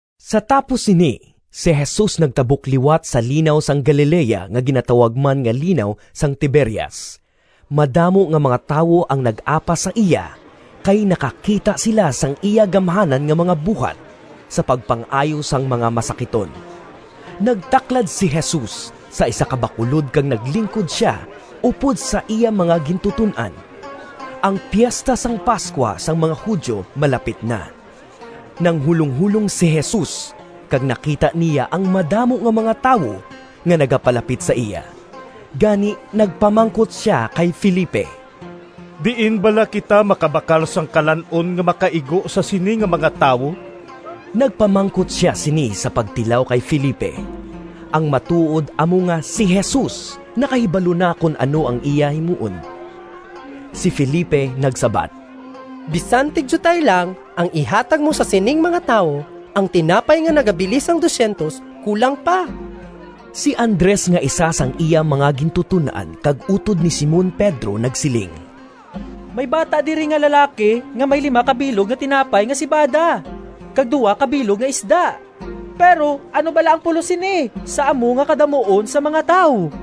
Sa tapos sini, si Jesus nagtabok liwat sa Linaw sang Galilea nga ginatawag man nga Linaw sang Tiberias. Madamo nga mga tawo ang nag-apas sa iya, kay nakakita sila sang iya gamhanan nga mga buhat sa pagpang-ayo sang mga masakiton. Nagtaklad si Jesus sa isa ka bakulod kag naglingkod sia upod sa iya mga gintuton-an. Ang Piesta sang Pascua sang mga Judio malapit na. Nanghulonghulong si Jesus kag nakita niya ang madamo nga mga tawo nga nagapalapit sa iya, gani nagpamangkot sia kay Felipe, “Diin bala kita makabakal sang kalan-on nga makaigo sa sini nga mga tawo?” (Nagpamangkot sia sini sa pagtilaw kay Felipe; ang matuod amo nga si Jesus nakahibalo na kon ano ang iya himuon.) Si Felipe nagsabat, “Bisan tigdiutay lang ang ihatag mo sa sining mga tawo, ang tinapay nga nagabili sang P200 kulang pa.” Si Andres nga isa sang iya mga gintuton-an kag utod ni Simon Pedro nagsiling, “May bata diri nga lalaki nga may lima ka bilog nga tinapay nga sebada kag duha ka bilog nga isda. Pero ano bala ang pulos sini sa amo nga kadamuon sang mga tawo?”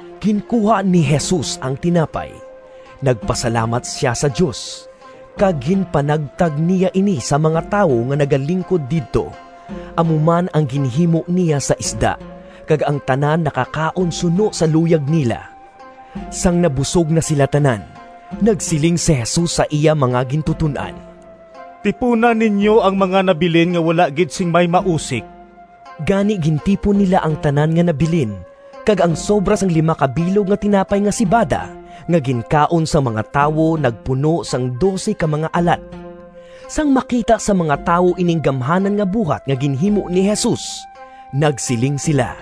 Ginkuha ni Jesus ang tinapay, nagpasalamat sia sa Dios, kag ginpanagtag niya ini sa mga tawo nga nagalingkod didto. Amo man ang ginhimo niya sa isda, kag ang tanan nakakaon suno sa luyag nila. Sang nabusog na sila tanan, nagsiling si Jesus sa iya mga gintuton-an, “Tipuna ninyo ang mga nabilin nga wala gid sing may mausik.” Gani gintipon nila ang tanan nga nabilin, kag ang sobra sang lima ka bilog nga tinapay nga sebada nga ginkaon sang mga tawo nagpuno sang dose ka mga alat. Sang makita sang mga tawo ining gamhanan nga buhat nga ginhimo ni Jesus, nagsiling sila,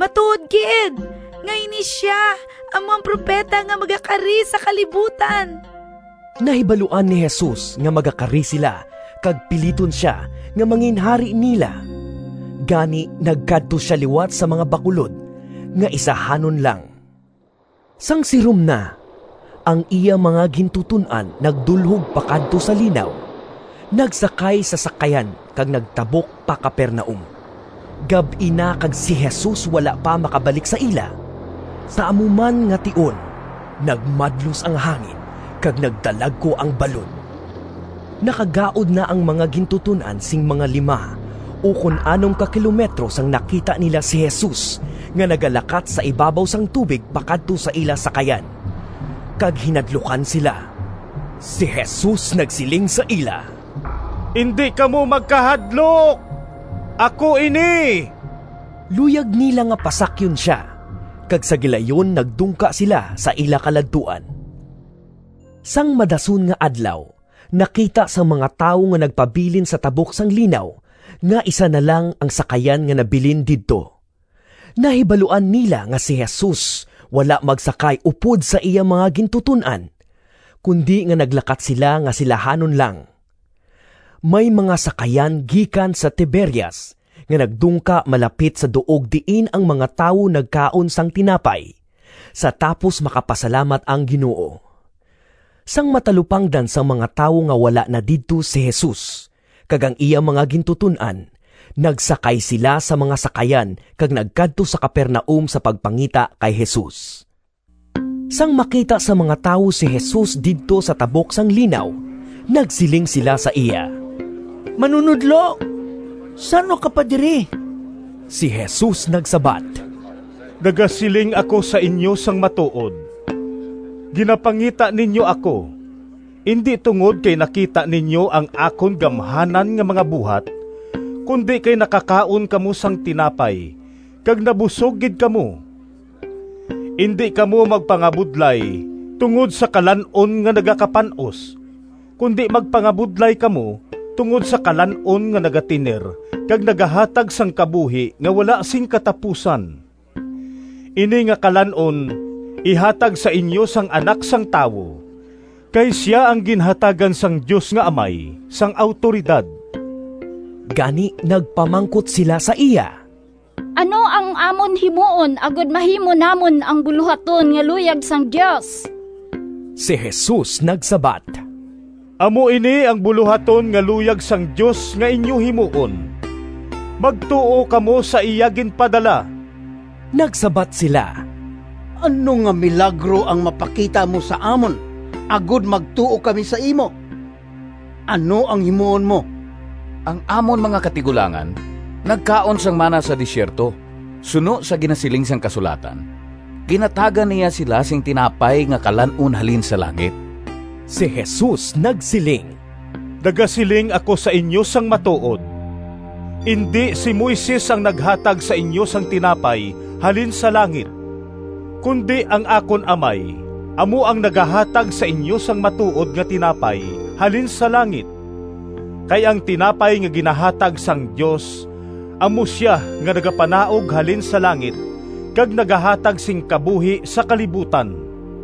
“Matuod gid nga ini sia amo ang Propeta nga magakari sa kalibutan!” Nahibaluan ni Jesus nga magakari sila kag piliton sia nga manginhari nila. Gani nagkadto sia liwat sa mga bakulod nga isahanon lang. Sang sirom na, ang iya mga gintuton-an nagdulhog pakadto sa linaw, nagsakay sa sakayan kag nagtabok pa Capernaum. Gab-i na kag si Jesus wala pa makabalik sa ila. Sa amo man nga tion nagmadlos ang hangin kag nagdalagku ang balod. Nakagaud na ang mga gintuton-an sing mga lima ukon anom ka kilometro sang nakita nila si Jesus nga nagalakat sa ibabaw sang tubig pakadto sa ila sakayan, kag hinadlukan sila. Si Jesus nagsiling sa ila, “Indi kamo magkahadlok, ako ini!” Luyag nila nga pasakyon sia; kag sa gilayon nagdungka sila sa ila kaladtuan. Sang madason nga adlaw, nakita sang mga tawo nga nagpabilin sa tabok sang linaw nga isa na lang ang sakayan nga nabilin didto. Nahibaluan nila nga si Jesus wala magsakay upod sa iya mga gintuton-an, kundi nga naglakat sila nga silahanon lang. May mga sakayan gikan sa Tiberias nga nagdungka malapit sa duog diin ang mga tawo nagkaon sang tinapay, sa tapos makapasalamat ang Ginoo. Sang matalupangdan sang mga tawo nga wala na didto si Jesus kag ang iya mga gintuton-an, nagsakay sila sa mga sakayan kag nagkadto sa Capernaum sa pagpangita kay Jesus. Sang makita sang mga tawo si Jesus didto sa tabok sang linaw, nagsiling sila sa iya, “Manunodlo, san-o ka pa diri?” Si Jesus nagsabat, “Nagasiling ako sa inyo sang matuod: ginapangita ninyo ako, indi tungod kay nakita ninyo ang akon gamhanan nga mga buhat, kundi kay nakakaon kamo sang tinapay kag nabusog gid kamo. Indi kamo magpangabudlay tungod sa kalan-on nga nagakapan-os, kundi magpangabudlay kamo tungod sa kalan-on nga nagatener kag nagahatag sang kabuhi nga wala sing katapusan. Ini nga kalan-on ihatag sa inyo sang Anak sang Tawo, kay sia ang ginhatagan sang Dios nga Amay sang awtoridad.” Gani nagpamangkot sila sa iya, “Ano ang amon himuon agod mahimo namon ang bulohaton nga luyag sang Dios?” Si Jesus nagsabat, “Amo ini ang bulohaton nga luyag sang Dios nga inyo himuon: magtuo kamo sa iya ginpadala.” Nagsabat sila, “Ano nga milagro ang mapakita mo sa amon, agod magtuo kami sa imo? Ano ang himuon mo? Ang amon mga katigulangan nagkaon sang mana sa desierto, suno sa ginasiling sang kasulatan, ‘Ginhatagan niya sila sing tinapay nga kalan-on halin sa langit.’” Si Jesus nagsiling, “Nagasiling ako sa inyo sang matuod: indi si Moises ang naghatag sa inyo sang tinapay halin sa langit, kundi ang akon Amay amo ang nagahatag sa inyo sang matuod nga tinapay halin sa langit. Kay ang tinapay nga ginahatag sang Dios amo sia nga nagapanaog halin sa langit kag nagahatag sing kabuhi sa kalibutan.”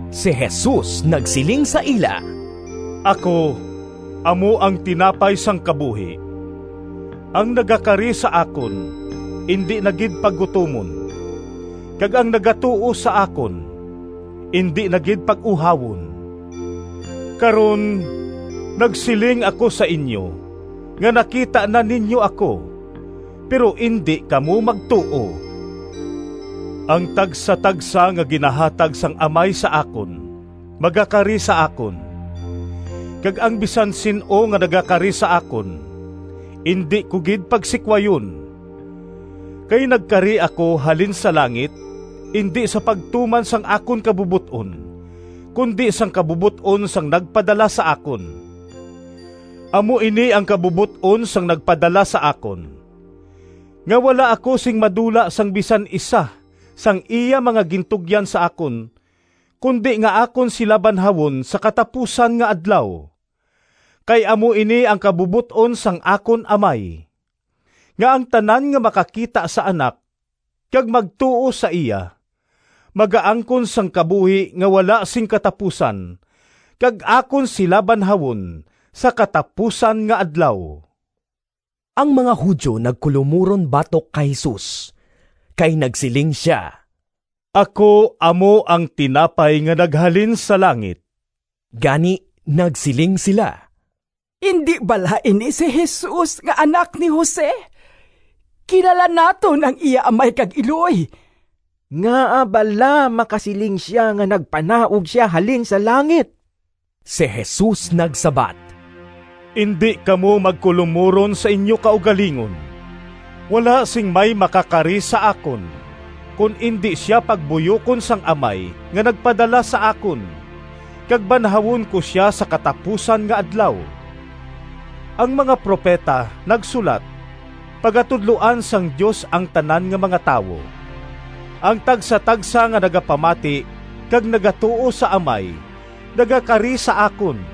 Si Jesus nagsiling sa ila, “Ako amo ang tinapay sang kabuhi. Ang nagakari sa akon indi na gid paggutomon, kag ang nagatuo sa akon indi na gid pag-uhawon. Karon, nagsiling ako sa inyo nga nakita na ninyo ako, pero indi kamo magtuo. Ang tagsatagsa nga ginahatag sang Amay sa akon magakari sa akon, kag ang bisan sin-o nga nagakari sa akon indi ko gid pagsikwayon. Kay nagkari ako halin sa langit indi sa pagtuman sang akon kabubot-on, kundi sang kabubot-on sang nagpadala sa akon. Amo ini ang kabubot-on sang nagpadala sa akon: nga wala ako sing madula sang bisan isa sang iya mga gintugyan sa akon, kundi nga akon sila banhawon sa katapusan nga adlaw. Kay amo ini ang kabubot-on sang akon Amay: nga ang tanan nga makakita sa Anak kag magtuo sa iya magaangkon sang kabuhi nga wala sing katapusan, kag akon sila banhawon sa katapusan nga adlaw.” Ang mga Judio nagkulomuron batok kay Jesus, kay nagsiling sia, “Ako amo ang tinapay nga naghalin sa langit.” Gani, nagsiling sila, “Indi bala ini si Jesus nga anak ni Jose? Kilala naton ang iya amay kag iloy. Ngaa bala makasiling sia nga nagpanaog sia halin sa langit?” Si Jesus nagsabat, “Indi kamo magkulomuron sa inyo kaugalingon. Wala sing may makakari sa akon, kon indi sia pagbuyokon sang Amay nga nagpadala sa akon, kag banhawon ko sia sa katapusan nga adlaw. Ang mga propeta nagsulat, ‘Pagatudloan sang Dios ang tanan nga mga tawo.’ Ang tagsatagsa nga nagapamati kag nagatuo sa Amay nagakari sa akon.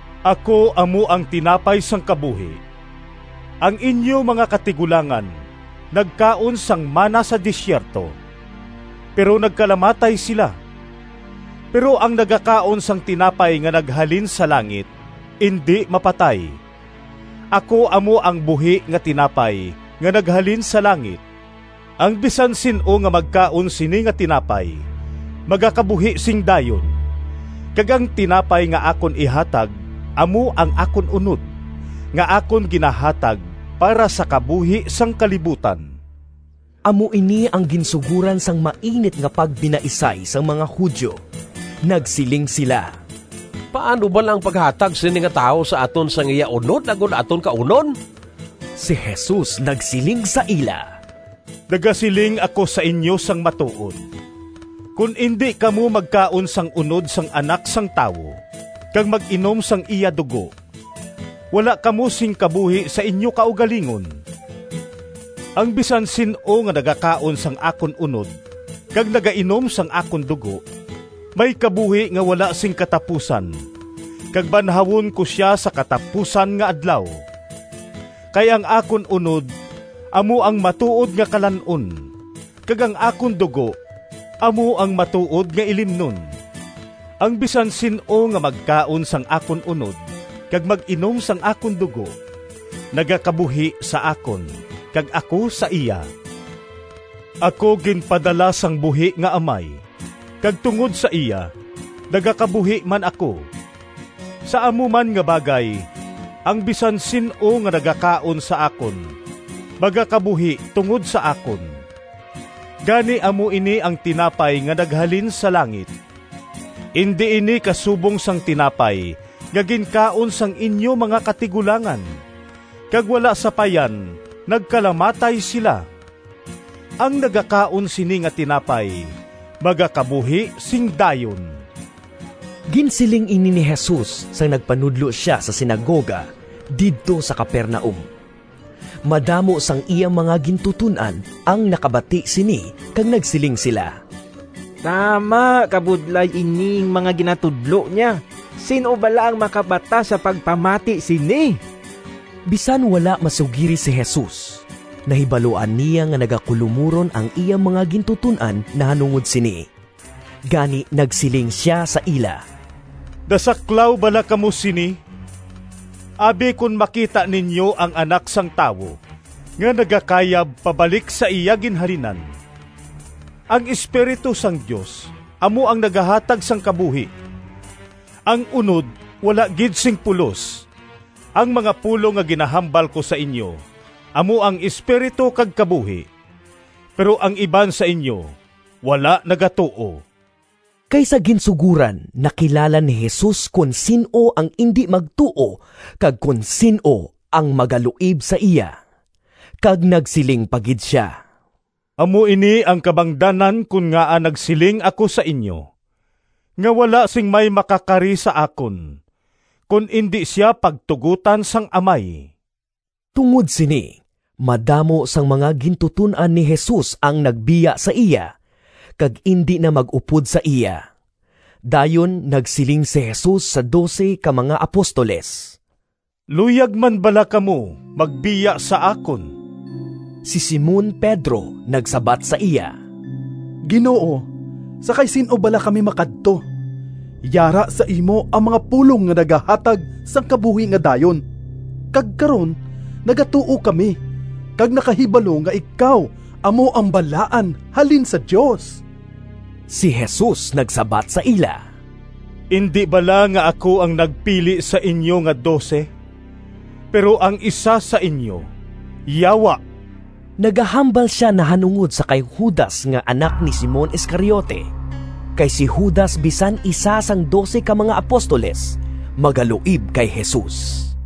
Ako amo ang tinapay sang kabuhi. Ang inyo mga katigulangan nagkaon sang mana sa desierto, pero nagkalamatay sila. Pero ang nagakaon sang tinapay nga naghalin sa langit indi mapatay. Ako amo ang buhi nga tinapay nga naghalin sa langit. Ang bisan sin-o nga magkaon sini nga tinapay magakabuhi sing dayon; kag ang tinapay nga akon ihatag amo ang akon unod, nga akon ginahatag para sa kabuhi sang kalibutan.” Amo ini ang ginsugoran sang mainit nga pagbinaisay sang mga Judio. Nagsiling sila, “Paano bala ang paghatag sini nga tawo sa aton sang iya unod agod aton kaunon?” Si Jesus nagsiling sa ila, “Nagasiling ako sa inyo sang matuod: kon indi kamo magkaon sang unod sang Anak sang Tawo kag mag-inom sang iya dugo wala kamo sing kabuhi sa inyo kaugalingon. Ang bisan sin-o nga nagakaon sang akon unod kag nagainom sang akon dugo may kabuhi nga wala sing katapusan kag banhawon ko sia sa katapusan nga adlaw. Kay ang akon unod amo ang matuod nga kalan-on, kag ang akon dugo amo ang matuod nga ilimnon. Ang bisan sin-o nga magkaon sang akon unod kag mag-inom sang akon dugo nagakabuhi sa akon kag ako sa iya. Ako ginpadala sang buhi nga Amay, kag tungod sa iya nagakabuhi man ako. Sa amo man nga bagay, ang bisan sin-o nga nagakaon sa akon magakabuhi tungod sa akon. Gani amo ini ang tinapay nga naghalin sa langit. Indi ini kasubong sang tinapay nga ginkaon sang inyo mga katigulangan, kag wala sapayan nagkalamatay sila. Ang nagakaon sini nga tinapay magakabuhi sing dayon.” Ginsiling ini ni Jesus sang nagpanudlo sia sa sinagoga didto sa Capernaum. Madamo sang iya mga gintuton-an ang nakabati sini kag nagsiling sila, “Tama kabudlay ining mga ginatudlo niya. Sin-o bala ang makabatas sa pagpamati sini?” Bisan wala masugiri si Jesus, nahibaluan niya nga nagakulomuron ang iya mga gintuton-an nahanungod sini. Gani nagsiling sia sa ila, “Nasaklaw bala kamo sini? Abi kon makita ninyo ang Anak sang Tawo nga nagakayab pabalik sa iya ginhalinan? Ang Espiritu sang Dios amo ang nagahatag sang kabuhi. Ang unod wala gid sing pulos. Ang mga pulong nga ginahambal ko sa inyo amo ang Espiritu kag kabuhi. Pero ang iban sa inyo wala nagatuo.” (Kay sa ginsugoran nakilala ni Jesus kon sin-o ang indi magtuo kag kon sin-o ang magaluib sa iya.) Kag nagsiling pa gid sia, “Amo ini ang kabangdanan kon ngaa nagsiling ako sa inyo nga wala sing may makakari sa akon, kon indi sia pagtugotan sang Amay.” Tungod sini, madamo sang mga gintuton-an ni Jesus ang nagbiya sa iya, kag indi na mag-upod sa iya. Dayon nagsiling si Jesus sa dose ka mga apostoles, “Luyag man bala kamo magbiya sa akon?” Si Simon Pedro nagsabat sa iya, “Ginoo, sa kay sin-o bala kami makadto? Yara sa imo ang mga pulong nga nagahatag sang kabuhi nga dayon. Kag karon nagatuo kami kag nakahibalo nga ikaw amo ang Balaan halin sa Dios.” Si Jesus nagsabat sa ila, “Indi bala nga ako ang nagpili sa inyo nga dose? Pero ang isa sa inyo yawa!” Nagahambal sia nahanungod sa kay Judas nga anak ni Simon Iscariote, kay si Judas bisan isa sang dose ka mga apostoles, magaluib kay Jesus.